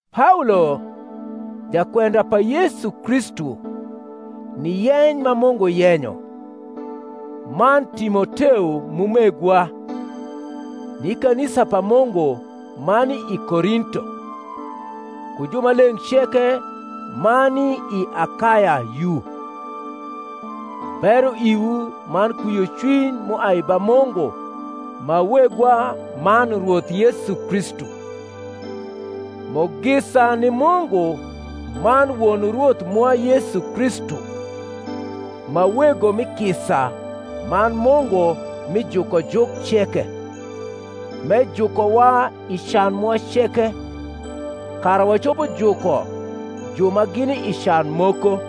Paolo, jakwenda pa Yesu Kristu ni yeny ma Mungu yenyo, man Timoteo m’umegwa, ni kanisa pa Mungu ma ni i Korinto, ku jumaleng’ ceke ma ni i Akaya yu: Bero iwu man kwiocwiny m’uai ba Mungu ma Wegwa man Rwoth Yesu Kristu. Mugisa ni Mungu man Won Rwoth mwa Yesu Kristu, ma Wego mi kisa man Mungu mi jukojuk ceke; m’ejukowa i can mwa ceke, kara wacopo juko ju ma gini i can moko,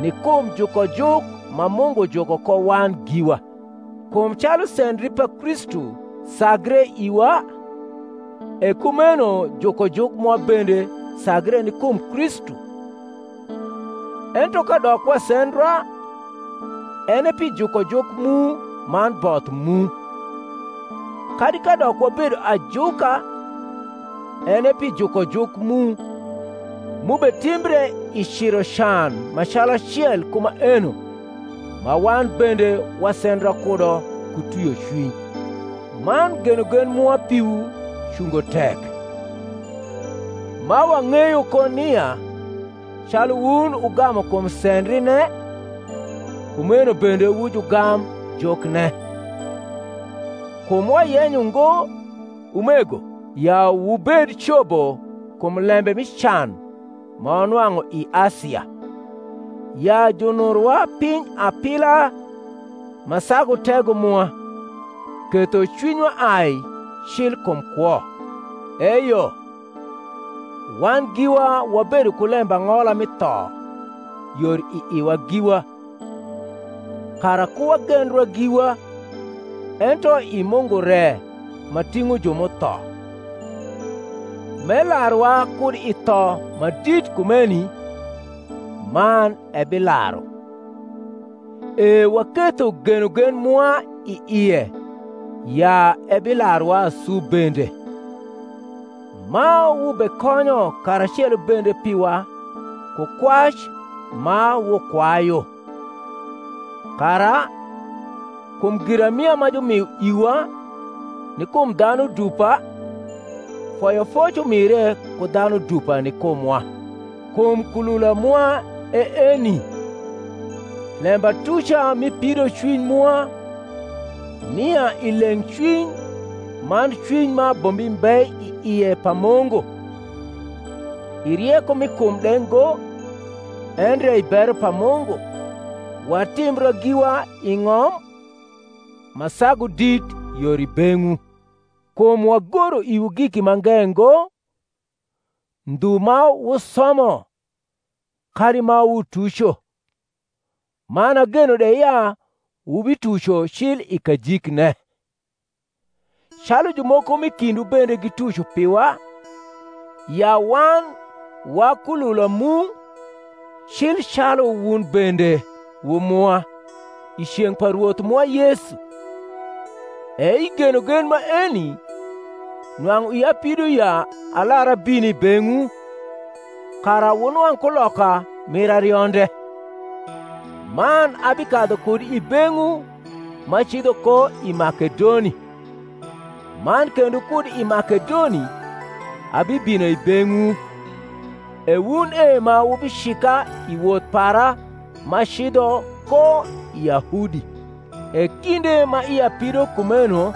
ni kum jukojuk ma Mungu juko ko wan giwa. Kum calu sendri pa Kristu sagre iwa, e kumeno jukojuk mwa bende sagre ni kum Kristu. Ento kadok wasendra, en e pi jukojuk mu man both mu; kadi kadok wabedo ajuka, en e pi jukojuk mu, m’ubetimbre i ciro can ma calacel ku maeno ma wan bende wasendra kudo ku twiocwiny: man genogen mwa piwu cungo tek; ma wang’eyo ko nia, calu wun wugamu kum sendrine, kumeno bende wu jugam jukne. Kum wayenyo ngo, umego, ya wubed cobo kum lembe mi can ma wanwang’u i Asia, ya junurowa piny apila, ma sagu tego mwa, ketho cwinywa ai cil kum kwo: eyo, wan giwa wabedo ku lembang’ola mi tho yor i iwa giwa, kara ku wagendra giwa, ento i Mungu re ma ting’o ju m’utho: m’elaruwa kud i tho ma dit kumeni, man ebilaru: e waketho genogen mwa i ie ya ebilaruwa asu bende; ma wubekonyo karacelo bende piwa ku kwac ma wukwayu; kara, kum giramia ma jumio iwa ni kum dhanu dupa, foyofoc umire ku dhanu dupa ni kumwa. Kum kulula mwa e eni, lembatuca mi pidocwiny mwa, nia i leng’cwiny man cwiny ma abombi mbe i ie pa Mungu, i rieko mi kum de ngo endre i bero pa Mungu, watimbra giwa i ng’om, ma sagu dit yor i beng’wu. Kum wagoro iwu giki mange ngo, ndhu ma wusomo kadi ma wutuco, man ageno de ya wubituco cil i kajikne: calu jumoko m’i kindwu bende gituco piwa, ya wan wa kniula mu, cil calu wun bende wu mwa, i ceng’ pa Rwoth mwa Yesu. E i genogen maeni nwang’u ia pido ya alar abin i beng’wu, kara wunwang’ kuloka mir arionde; man abikadhu kud i beng’wu m’acidho ko i Makedoni, man kendo kud i Makedoni abibino i beng’wu, e wun e ma wubicika i woth para m’acidho ko i Yahudi. E kinde ma ia pido kumeno,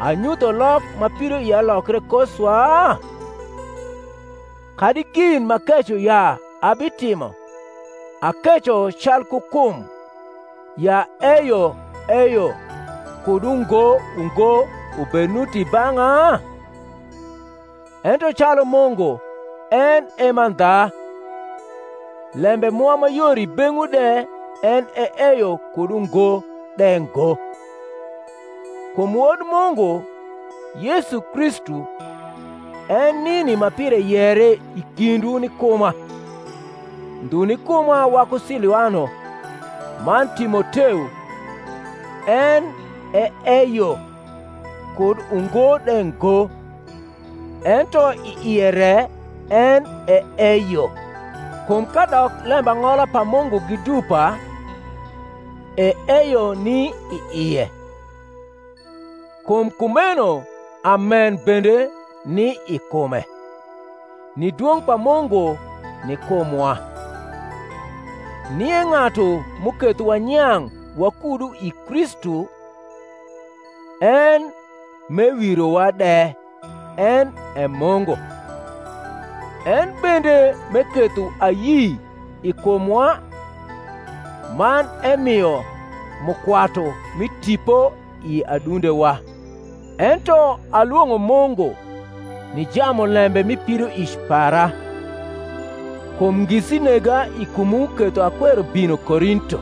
anyutho lok ma pidoia lokre ko swa? kadi gin m’akeco ya abitimo, akeco calku kum, ya eyo eyo kud ungo ungo ubed nuti i bang’a? Ento calu Mungu en e mandha, lembe mwa ma yor i beng’wu de en e eyo kud ungo de ngo. Kum Wod Mungu, Yesu Kristu, en nini ma pire yere i kindwu ni kuma, ndhu ni kuma waku Siluano man Timoteo, en e eyo kud ungo de ngo, ento i ie re en e eyo. Kum kadok lembang’ola pa Mungu gi dupa, e eyo ni i ie: kum kumeno amen bende ni i kume, ni dwong’ pa Mungu ni kumwa. Nie ng’atu m’uketho wanyang’ wakudu i Kristu, en m’ewirowa de, en e Mungu; en bende m’eketho ayi i kumwa, man emio mukwatu mi Tipo i adundewa. Ento alwong’o Mungu ni jamulembe mi pidoic para, kum ngisi nega i kumwu ketho akwero bino Korinto.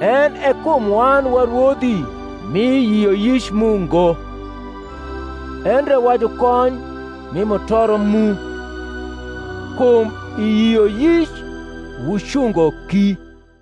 En e kum wan wa rwodhi mi yioyic mu ngo, endre wa jukony mi mutoro mu: kum i yioyic wucungo ki.